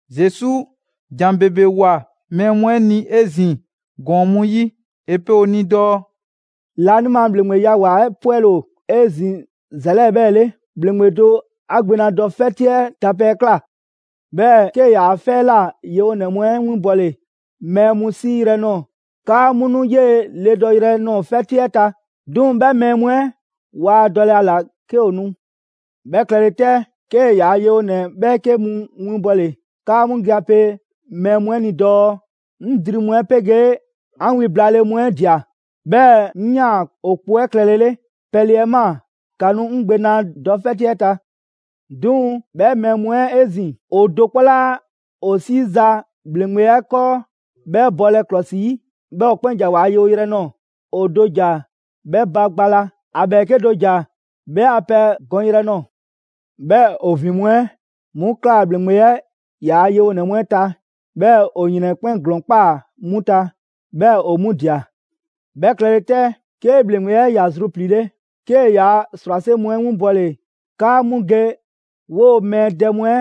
Zesu ‑jan ‑bebe ꞊woa mɛɛ mu 'ɛ ni 'ezin‑ ‑gɔɔn mu 'yi. ‑E pe ‑o ni dɔɔ: «Laanima ‑Bhleŋgbeya ‑wa ‑a 'pwɛle‑ ‑o 'ezin‑ ‑za 'lɛɛ‑ 'bhɛɛ‑ 'le: ‑Bhleŋgbe do 'a gbe na dɔ 'fɛti 'ɛ ta pɛ 'ɛ ꞊kla. 'Bhɛɛ‑ 'kee‑ ‑yaa' 'fɛ 'ɛ ꞊la yewonɛ mu 'ɛ winbɔle mɛɛ mu 'siiyrɛ‑ nɔɔ‑ 'kaa 'mu nu 'yee‑ ledɔyrɛ nɔɔ‑ 'fɛti 'ɛ ta, 'duŋ‑ 'bhɛ mɛɛ mu 'ɛ waa dɔlɛ ‑a ‑la 'ke ‑o nu. 'Bhɛ klɛle 'tɛ, 'kee‑ ‑yaa' yewonɛ 'bhɛɛke mu winbɔle 'kaa 'mu ge ‑a pe mɛɛ mu 'ɛ ni dɔɔ: ‹'Ŋ dri mu 'ɛ 'pegee 'an wi blaale mu 'ɛ ꞊dia, 'bhɛɛ‑ 'ŋ ꞊yaan ‑o kpo 'ɛ klɛlele. Pɛle 'ɛ ꞊maa, ‑ka nu 'ŋ gbe na dɔ 'fɛti 'ɛ ta!› 'Duŋ‑ 'bhɛ mɛɛ mu 'ɛ 'ezin‑, ‑o do 'kpɔ 'laa ‑o 'siiza‑ ‑bhleŋgbe 'ɛ 'kɔɔ 'bhɛ bɔlɛ ‑klɔsi 'yi, 'bhɛɛ‑ ‑o 'kpɛn ‑ja ‑waa' yewoyrɛ nɔɔ‑: ‑O do ‑ja 'bhɛ ba gba la, ‑a ‑bhɛɛke' do ‑ja 'bhɛ a pɛ gɔnyrɛ ꞊nɔɔ; 'bhɛɛ‑ ‑o ‑vin mu 'ɛ 'mu ꞊klaa ‑bhleŋgbe 'ɛ ‑yaa' yewonɛ mu 'ɛ ta, 'bhɛɛ‑ ‑o ‑yrɛn 'ɛ 'kpɛn ‑glɔɔn ‑kpaa 'mu ta, 'bhɛɛ‑ ‑o 'mu ꞊dia. 'Bhɛ klɛle 'tɛ, 'ke ‑bhleŋgbe 'ɛ ‑ya zrupliile, 'kee‑ yaa ‑srwase' mu 'ɛ 'winbɔle 'kaa 'mu ge 'woo‑ mɛɛ dɛ mu 'ɛ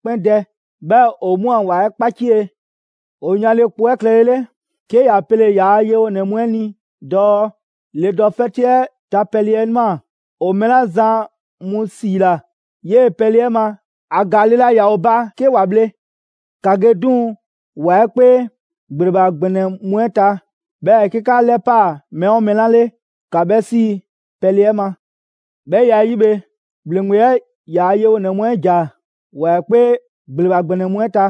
'kpɛn dɛ, 'bhɛɛ‑ ‑o 'mu a ‑wa 'ɛ 'kpacie. ‑O yanle kpo 'ɛ klɛlele, 'ke ‑ya pele‑ ‑yaa' yewonɛ mu 'ɛ ni dɔɔ: ‹Le dɔ 'fɛti 'ɛ ta pɛle 'ɛ ꞊maa, ‑o mɛɛ 'la zan mu 'siila‑ 'yee‑ pɛle 'ɛ ma, ‑a ‑gaale' laa ‑yaa ‑o ba 'ke ‑wa bhle. ‑Ka ge 'duŋ‑ ‑wa 'ɛ 'kpee ‑gbleba ‑gbɛnɛ mu 'ɛ ta, 'bhɛɛ‑ 'ke 'ka 'lɛpaa‑ mɛɛ 'oo mɛɛ 'la 'le, ‑ka 'bhɛ 'sii‑ pɛle 'ɛ ma.› 'Bhɛ ya 'ɛ 'yi bhe, ‑bhleŋgbe 'ɛ ‑yaa' yewonɛ mu 'ɛ ‑ja ‑wa 'ɛ 'kpee ‑gbleba ‑gbɛnɛ mu 'ɛ ta,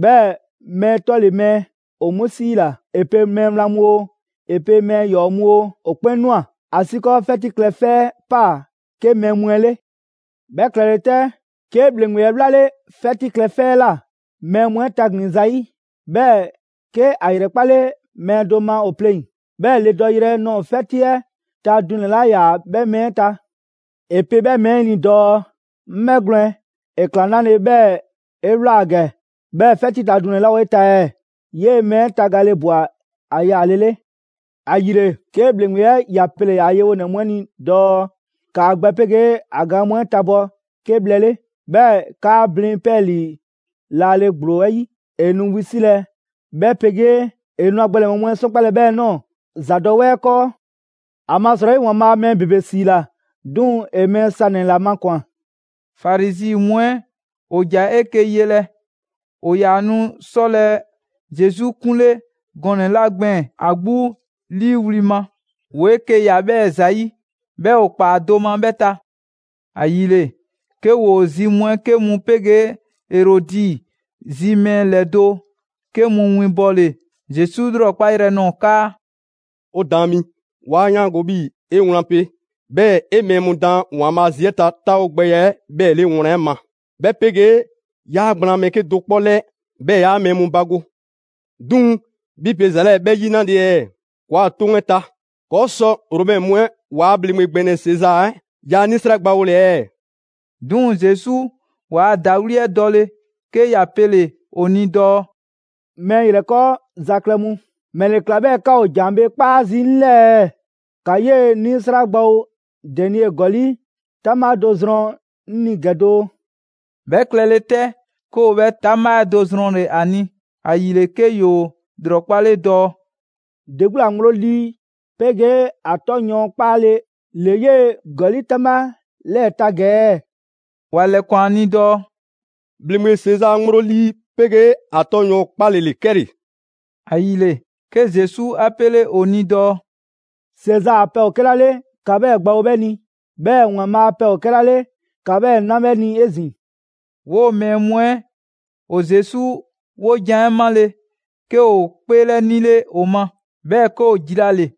'bhɛɛ‑ mɛɛ 'tɔle‑ mɛɛ ‑o 'mu 'siila‑; 'e pe mɛɛ wlan mu oo, 'e pe mɛɛ ‑yɔɔ' mu oo, ‑o 'kpɛn ꞊nwa, ‑asiikɔɔ 'fɛti klɛ 'fɛ 'ɛ ꞊paa 'ke mɛɛ mu 'ɛ 'le.» «'Bhɛ klɛle 'tɛ, 'ke ‑bhleŋgbe 'ɛ 'wlale 'fɛti klɛ 'fɛ 'ɛ ꞊la mɛɛ mu 'ɛ taglin‑ zayi'. 'Bhɛɛ‑, 'ke ‑a ‑yrɛkpale mɛɛ do ma ‑o pleŋ‑, 'bhɛɛ‑ le dɔyrɛ nɔɔ‑ 'fɛti 'ɛ ta dunɛ‑ 'laa ‑yaa 'bhɛ mɛɛ 'ɛ ta. ‑E pe 'bhɛ mɛɛ 'ɛ ni dɔɔ: ‹'Ŋ 'bhɛgwlɛn‑, ‑e ꞊kla 'nale‑ 'bhɛɛ‑ 'e ꞊wlaa gɛ, 'bhɛɛ‑ 'fɛti ta dunɛ‑ 'laa ‑o 'e ta ɛɛ?› 'Yee‑ mɛɛ 'ɛ tagale ꞊bwa ‑a yaalele. ‑Ayile, 'ke ‑bhleŋgbe 'ɛ ‑ya pele‑ ‑yaa' yewonɛ mu 'ɛ ni dɔɔ: ‹‑Kaa gbɛ 'pegee ‑a gaan mu 'ɛ tabɔ 'ke bhlɛ 'le, 'bhɛɛ‑ ‑kaa blin 'pɛɛlii‑ laale ‑gblo 'ɛ 'yi. ‑E nu wisilɛ 'bhɛ 'pegee ‑e nu ‑a gbɛnɛbhɛ mu 'ɛ 'sɔnkpalɛ 'bhɛɛ‑ ꞊nɔɔ ‑zadɔwɛɛ 'ɛ 'kɔɔ.› ‑Amasrɔyi, ‑Waanbhaa' mɛɛ ‑bebe 'siila‑, 'duŋ‑ ‑e mɛɛ sanɛ‑ ‑la makwan‑.» Farizi mu 'ɛ ‑o ‑ja 'eke‑ yelɛ. ‑O ‑yaa nu 'sɔlɛ‑ Zesu 'kunle gɔnɛ‑ 'la gbɛɛn‑ ‑a 'gbu 'liiwli‑ ma, ‑woo 'eke‑ ꞊ya 'bhɛɛ‑ ‑zayi', 'bhɛɛ‑ ‑o ꞊kpaa do ma 'bhɛ ta. ‑Ayile, 'ke ‑woo zi mu 'ɛ 'ke mu 'pegee Erɔdi zi mɛɛ ‑lɛdo' 'ke mu winbɔle Zesu 'lrɔkpa yrɛ nɔɔ‑ 'kaa: «'O Daan mi, 'wa 'yaango‑ 'bhii‑ 'e wlan pe, 'bhɛɛ‑ 'e mɛɛ mu daan ‑Waanbhaa' zi 'ɛ ta 'taawogbɛya 'ɛ 'bhɛɛ‑ 'le wlan 'ɛ ma, 'bhɛ 'pegee 'yaa gblaan mɛɛ 'kedo‑ 'kpɔ 'lɛɛ, 'bhɛɛ‑ 'yaa mɛɛ mu bago. 'Duŋ‑, 'bhi pe ‑za 'lɛɛ‑ 'bhɛ 'yi 'nale‑ ɛɛ? ‑Kɔɔa' 'toŋ 'ɛ ta, kɔɔ' sɔ Romɛ mu 'ɛ ‑waa' ‑bhleŋgbe ‑gbɛnɛ Sezaa 'ɛ ‑yaa' 'nisra 'ɛ gbawole ɛɛ?» 'Duŋ‑ Zesu ‑waa' ‑dawli' 'ɛ dɔle 'ke ‑ya pele‑ ‑o ni dɔɔ: «Mɛɛ ‑yrɛkɔɔza klɛ mu, ‑mɛle ꞊kla 'bhɛɛ‑ 'ka ‑o ‑jan bhee 'kpaa zii' 'ŋ 'lɛɛ ɛɛ? ‑Ka 'yee‑ 'nisra gbawo denie ‑gɔli' 'taŋbha do zrɔn 'ŋ ni ‑gɛ doo!» 'Bhɛ klɛle 'tɛ, 'ke ‑o 'bhɛ 'taŋbha 'ɛ do zrɔnle‑ ‑a ni. ‑Ayile, 'ke ‑yoo ‑lrɔkpale dɔɔ: «‑De 'gbu ‑la ŋgblo lii 'pegee ‑a 'tɔ yɔɔn 'kpaale‑ ‑le 'yee‑ ‑gɔli' 'taŋbha 'lɛɛ‑ ta ‑gɛ ɛɛ?» ‑Wa ‑lɛkwan ‑a ni dɔɔ: «‑Bhleŋgbe Sezaa ŋgblo lii 'pegee ‑a 'tɔ yɔɔn 'kpaale ‑le 'kɛle‑.» ‑Ayile, 'ke Zesu a 'pele ‑o ni dɔɔ: «Sezaa a pɛ ‑o 'kɛla 'le ‑ka 'bhɛɛ‑ gbawo 'bhɛ ni, 'bhɛɛ‑ ‑Waanbhaa' a pɛ ‑o 'kɛla 'le ‑ka 'bhɛɛ‑ 'na 'bhɛ ni 'ezin‑.» 'Woo‑ mɛɛ mu 'ɛ ‑o Zesu 'wojan‑ 'ɛ 'male‑, 'ke ‑o 'kpeelɛnile ‑o ma, 'bhɛɛ‑ 'ke ‑o jilale.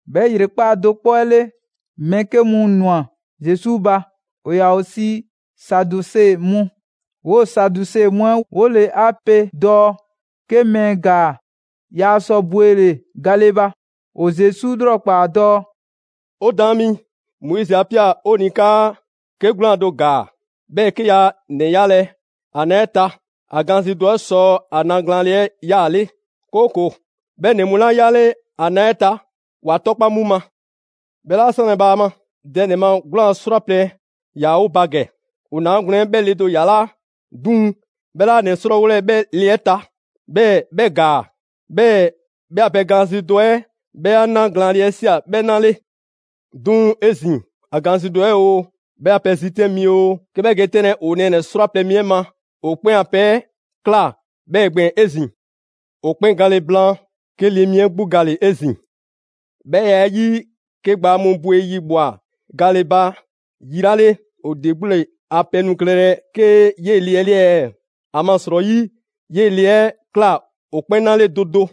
'Bhɛ ‑yrekpaa' do 'kpɔ 'ɛ 'le, mɛɛ 'ke mu ꞊nwa Zesu ba; ‑o ‑yaa ‑o sii Saduse mu. 'Woo‑ Saduse mu 'ɛ 'wole‑ 'a pe dɔɔ 'ke mɛɛ ‑gaa, yaa sɔ bwele‑ gale ba. ‑O Zesu 'lrɔkpaa‑ dɔɔ: «'O Daan mi, Moizi 'a ꞊pia 'o ni 'kaa: ‹'Ke 'gwlaan‑ do ‑gaa, 'bhɛɛ‑ 'ke yaa ‑nɛ 'yalɛ‑ ‑a na 'ɛ ta, ‑a gaanzidɔ 'ɛ sɔ ‑a na glaanle 'ɛ 'yaale; 'kooko‑ 'bhɛ ‑nɛ mu 'la 'yale ‑a na 'ɛ ta, ‑wa 'tɔkpa‑ 'mu ma.› 'Bhɛ 'laa 'sanlɛ‑ bhaama: Dɛ ‑nɛ ma 'gwlaan‑ 'srwaplɛ‑ ‑yaa 'o ba ‑gɛ. ‑O 'naagwlɛn‑ 'ɛ 'bhɛ le do ‑yalaa', 'duŋ‑ 'bhɛ 'laa ‑nɛ 'srɔɔwolɛ 'bhɛ le 'ɛ ta, 'bhɛɛ‑ 'bhɛ ‑gaa. 'Bhɛɛ‑ 'bhɛ a pɛ gaanzidɔ 'ɛ 'bhɛ ‑a na glaanle 'ɛ ꞊sia 'bhɛ 'na 'le. 'Duŋ‑ 'ezin‑, ‑a gaanzidɔ 'ɛ oo, 'bhɛ a pɛ zitɛn' oo, 'ke 'bhɛ ge 'tɛnlɛ‑ ‑o nɛɛnɛ‑ 'srwaplɛ‑ mi 'ɛ ma, ‑o 'kpɛn a pɛ 'ɛ ꞊kla 'bhɛɛ‑ gbɛɛn‑ 'ezin‑. ‑O 'kpɛn gale blaan, 'ke le mi 'ɛ 'gbu gale‑ 'ezin‑. 'Bhɛ ya 'ɛ 'yi, 'ke gbaa mu bwe yi ꞊bhwa gale ba yi 'la 'le, ‑o ‑de 'gbu ‑le a pɛ nu klɛlɛ 'ke 'yee‑ le 'ɛ 'le ɛɛ? ‑Amasrɔyi 'yee ‑le 'ɛ ‑e ꞊kla ‑o 'kpɛn 'na 'le do do.»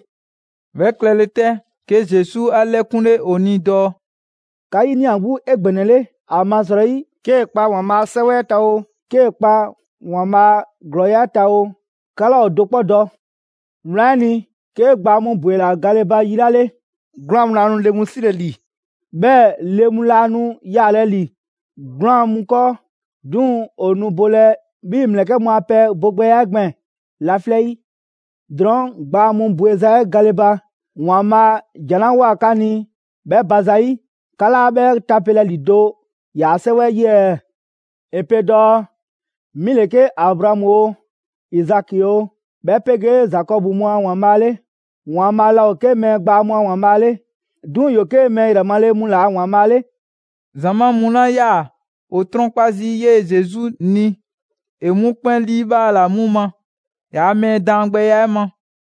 'Bhɛ klɛle 'tɛ, 'ke Zesu 'a 'lɛkunle ‑o ni dɔɔ: «'Ka 'yinia‑ 'gbu 'egbɛnɛle, ‑amasrɔyi 'kee‑ kpa ‑Waanbhaa' a 'Sɛwɛ 'ɛ ta oo, 'kee‑ kpa ‑Waanbhaa' a ‑glɔɔya' 'ɛ ta oo, 'ka 'laa ‑o do 'kpɔ dɔ. Wlan 'ɛ ni, 'ke gbaa mu ‑bwela gale ba yi 'la 'le, 'gwlaan‑ mu laa nu le mu 'silɛ‑ ‑li, 'bhɛɛ‑ le mu laa nu yaalɛ ‑li 'gwlaan‑ mu 'kɔɔ, 'duŋ‑ ‑o nu bolɛ 'bhii‑ ‑mlɛkɛ' mu a pɛ bogbɛya 'ɛ gbɛɛn‑ laflɛ' 'yi! Drɔɔn', gbaa mu bweza 'ɛ gale ba ‑Waanbhaa' ‑jan 'la ꞊woa 'ka ni 'bhɛ ba zayi', 'ka 'laa 'bhɛ tapelɛ ‑lido' ‑yaa' 'Sɛwɛ 'yi ɛɛ? ‑E pe dɔɔ: ‹'Mi 'le 'ke Abraamu oo, Izaki oo, 'bhɛ 'pegee Zakɔbu mu a ‑Waanbhaa' 'le.› ‑Waanbhaa' laa ‑o 'ke mɛɛ gbaa mu a ‑Waanbhaa' 'le, 'duŋ‑ ‑yoo 'ke mɛɛ yrɛ male mu ‑la ‑Waanbhaa' 'le.» ‑Zamaa' mu 'la 'yaa‑ ‑o 'trɔnkpa zii' 'yee‑ Zesu ni, ‑e 'mu 'kpɛn 'liibhaala 'mu ma ‑yaa' mɛɛ daangbɛya 'ɛ ma.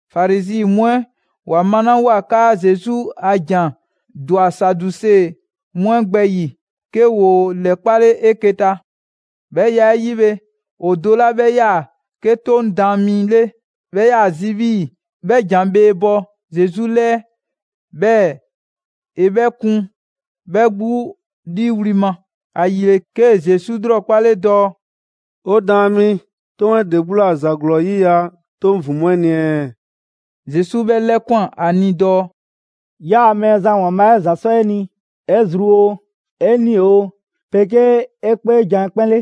Farizi mu 'ɛ ‑wa malawoa 'kaa Zesu a ‑jan ‑dwa Saduse mu 'ɛ gbɛ ‑yi, 'ke ‑woo ‑lɛkpale 'eke‑ ta. 'Bhɛ ya 'ɛ 'yi bhe, ‑o do 'la 'bhɛ 'yaa‑ 'ke 'Toŋ daan mi 'le 'bhɛ 'yaa‑ zi 'bhii‑ 'bhɛ ‑jan bhee bɔ Zesu 'lɛɛ, 'bhɛɛ‑ ‑e 'bhɛ kun 'bhɛ 'gbu 'liiwli‑ ma; ‑ayile 'kee‑ Zesu 'lrɔkpale dɔɔ: «'O Daan mi, 'toŋ 'ɛ ‑de 'gbu ‑la ‑za ‑glɔɔ 'yiya‑ 'toŋ ‑vin mu 'ɛ ni ɛɛ?» Zesu 'bhɛ 'lɛkwan‑ ‑a ni dɔɔ: «‹'Yaa‑ Mɛɛzan ‑Waanbhaa' 'ɛ ‑za 'sɔ 'e ni 'e zru oo, 'e 'nii‑ oo, 'pegee 'e 'kpeejan‑ 'ɛ 'kpɛn 'le.›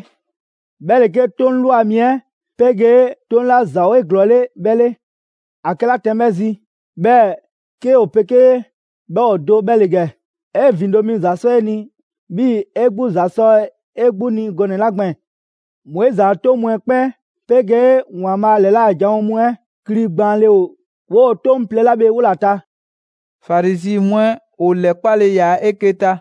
'Bhɛ ‑le 'ke 'toŋ ꞊lwa mi 'ɛ 'pegee 'toŋ 'la ‑za ‑o 'eglɔɔle 'bhɛ 'le. ‑A 'kɛla tɛn 'bhɛ zi, 'bhɛɛ‑ 'ke ‑o 'pegee 'bhɛ ‑o do 'bhɛ ‑le ‑gɛ: ‹'E ‑vindo' mi ‑za 'sɔ 'e ni 'bhii‑ 'e 'gbu ‑za sɔ 'e 'gbu ni gɔnɛ‑ 'la gbɛɛn‑.› Moizi a 'toŋ mu 'ɛ 'kpɛn 'pegee ‑Waanbhaa' ‑lɛla' janwo mu 'ɛ kli gbaanle ‑o 'woo‑ 'toŋ plɛ 'la bhe 'wola‑ ta.» Farizi mu 'ɛ ‑o 'lɛkpale ‑yaa 'eke‑ ta,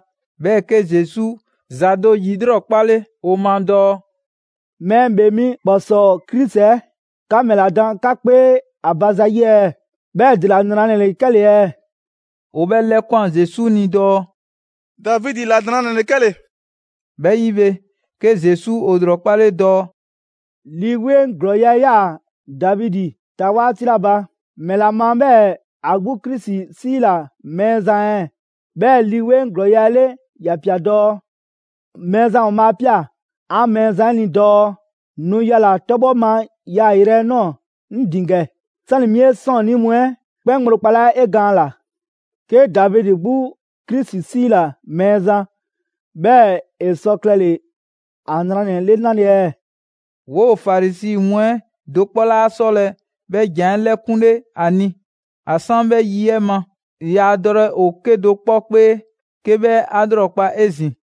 'bhɛɛ‑ 'ke Zesu ‑za do ‑yilrɔkpale ‑o ma dɔɔ: «Mɛɛ ‑Bhee Mi ‑kpɔsɔɔ Krisi 'ɛ, 'ka ‑mɛla dan 'ka 'kpee ‑a ba zayi' ɛɛ? 'Bhɛɛ‑ ‑dela ‑nranɛ ‑le 'kɛle‑ ɛɛ?» ‑O 'bhɛ 'lɛkwan‑ Zesu ni dɔɔ: «Davidi ‑la 'nranɛ‑ ‑le 'kɛle‑.» 'Bhɛ 'yi bhe, 'ke Zesu ‑o ‑lrɔkpale dɔɔ: «Lii 'Weŋ ‑glɔɔya' 'ɛ 'yaa‑ Davidi ta 'waati 'la ba, ‑mɛla ma 'bhɛɛ‑ ‑a 'gbu Krisi 'siila‑ Mɛɛzan ɛɛ? 'Bhɛɛ‑ Lii 'Weŋ ‑glɔɔya' 'ɛ 'le ‑ya ꞊pia dɔɔ: ‹Mɛɛzan ‑Waanbhaa' 'a ꞊pia 'an Mɛɛzan 'ɛ ni dɔɔ nu yala‑ 'tɔbhɔ ma yaayrɛ 'ɛ ꞊nɔɔ 'ŋ ‑din ‑gɛ, 'sani‑ 'mi 'e 'sɔɔnnii mu 'ɛ 'kpɛn ŋgblo kpalaa' 'e gaan ꞊la.›» «'Ke Davidi 'gbu Krisi 'siila‑ ‹Mɛɛzan›. 'Bhɛɛ‑ ‑e sɔ klɛle‑ ‑a ‑nranɛ 'le 'nale ɛɛ?» 'Woo Farizi mu 'ɛ do 'kpɔ 'laa 'sɔlɛ‑ 'bhɛ ‑jan 'ɛ 'lɛkunle 'a ni. ‑A 'san 'bhɛ yi 'ɛ ma, yaa dɔlɛ ‑o 'kedo‑ 'kpɔ 'kpee 'ke 'bhɛ 'a 'lrɔkpale 'ezin‑.